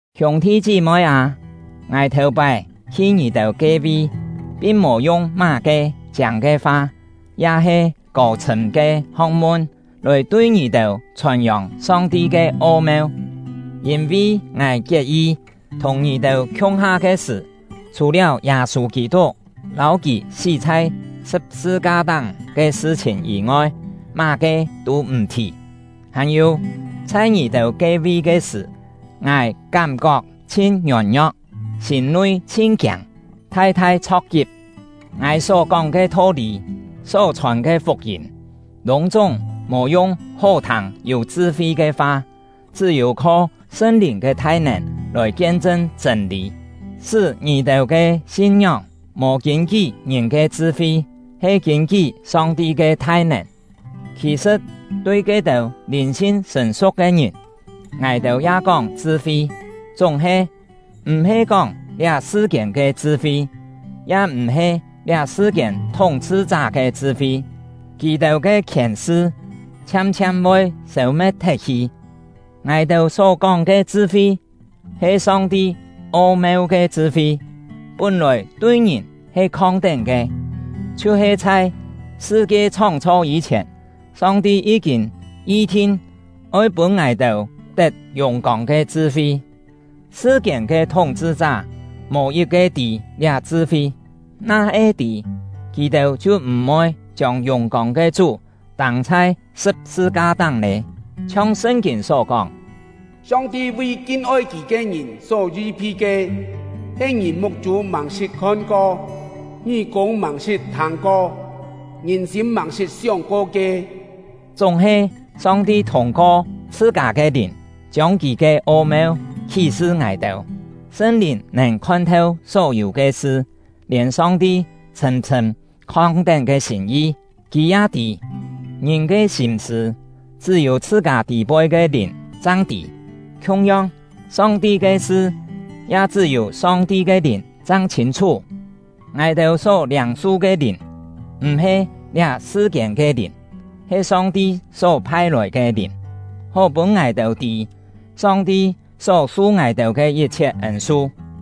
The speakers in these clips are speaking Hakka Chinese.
Hiûng-thi chí-moi â, ngài thèu-pái hi ngì-têu ke-vi, pin mò yung má-ke chiâng ke fa ya-he kô-chhṳ̂m ke ho̍k-mun lòi tui ngì-têu chhòn-yòng Song-ti ke o-meu “o-meu” yû-têu kú-kién he “kien-chṳn”.. Yîn-vi ngài kiet-yi, thùng ngì-têu khiung-ha ke sṳ̀, chhù-liáu Yâ-sû Kî-tuk lâu kì sí chhai sṳ̍p-sṳ-ka-táng ke sṳ-chhìn yî-ngoi, má-ke tû m̀ thì. Hàn-yû, chhai ngì-têu ke-vi ke sṳ̀, ngài kám-kok chhin ngiôn-ngio̍k, sîm-nui chhin kiâng, thai-thai chho̍k-kip. Ngài só-kóng ke tho-lî, só-chhòn ke fuk-yîm, lûng-chúng mò yung hó-thâng yû chṳ-fi ke fa, chṳ́-yû kho Sṳn-Lìn ke thai-nèn lòi kien-chṳn chṳ̂n-lî, sṳ́ ngì-têu ke sin-ngióng mò kîn-kí ngìn ke chṳ-fi, he kîn-kí Song-ti ke thai-nèn. Khì-sṳ̍t, tui ke-têu lìn-sin sṳ̀n-su̍k ke ngìn, ngài-têu ya kóng chṳ-fi. Chúng-he, m̀-he kóng liá sṳ-kiên ke chṳ-fi, ya m̀-he liá sṳ-kiên thúng-chhṳ-chá ke chṳ-fi; kì-têu ke khièn-sṳ chhiam-chhiam voi sêu-me̍t thet-hi. Ngài-têu só-kóng ke chṳ-fi he Song-ti o-meu ke chṳ-fi, pún-lòi tui ngìn he khong-tén ke, chhiu-he chhai sṳ-kie chhóng-chho yî-chhièn Song-ti yí-kîn yi-thin oi pûn ngài-têu tet yùng-kông ke chṳ-fi. Sṳ-kiên ke thúng-chhṳ-chá mò yit-ke tî liá chṳ-fi; na-he tî, kì-têu chhiu m̀-voi chiông yùng-kông ke Chú tâng chhai sṳ̍p-sṳ-ka-táng lé. Chhiong Sṳn-kîn só kóng: Song-ti vi kin-oi Kì ke ngìn só yi-phi ke, he ngìn muk-chû màng-sṳt khon-ko, ngí-kûng màng-sṳt thâng-ko, ngìn-sîm màng-sṳt sióng-ko ke! Chúng-he, Song-ti thûng-ko chhṳ-kâ ke Lìn chiông Kì ke o-meu khí-sṳ ngài-têu. Sṳn-Lìn nèn khon-theu só-yû ke sṳ, lièn Song-ti chhṳ̂m-chhṳ̂m khong-tén ke sîm-yi, Kì ya tî. Ngìn ke sîm-sṳ̂, chṳ́-yû chhṳ-kâ tî-poi ke lìn chang tî. Khiung-yong, Song-ti ke sṳ, ya chṳ́-yû Song-ti ke Lìn chang chhîn-chhú. Ngài-têu só liâng-su ke Lìn m̀-he liá sṳ-kiên ke lìn, he Song-ti só phai-lòi ke Lìn, hó-pûn ngài-têu tî Song-ti só su ngài-têu ke yit-chhiet ên-su.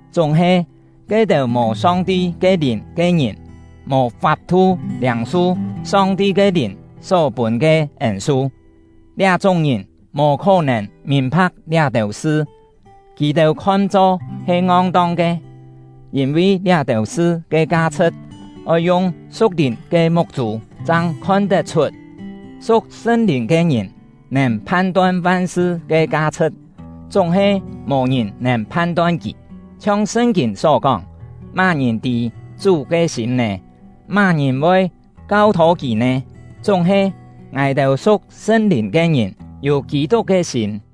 Chúng-he, ke-têu mò Song-ti ke Lìn ke ngìn mò fap-thu liâng-su Song-ti ke Lìn só pûn ke ên-su. Liá-chúng ngìn mò khó-nèn mìn-pha̍k liá-têu sṳ, kì-têu khon-cho he ngong-tong ke; yîn-vi liá-têu sṳ ke ka-chhṳ̍t oi yung su̍k-lìn ke muk-chû chang khon tet-chhut. Su̍k Sṳn-Lìn ke ngìn nèn phan-ton van-sṳ ke ka-chhṳ̍t, chúng-he mò-ngìn nèn phan-ton kì. Chhiong Sṳn-kîn só kóng: Má-ngìn tî Chú ke sîm nè? Má-ngìn voi kau-thô Kì nè? Chúng-he, ngài-têu su̍k Sṳn-Lìn ke ngìn yû Kî-tuk ke sîm.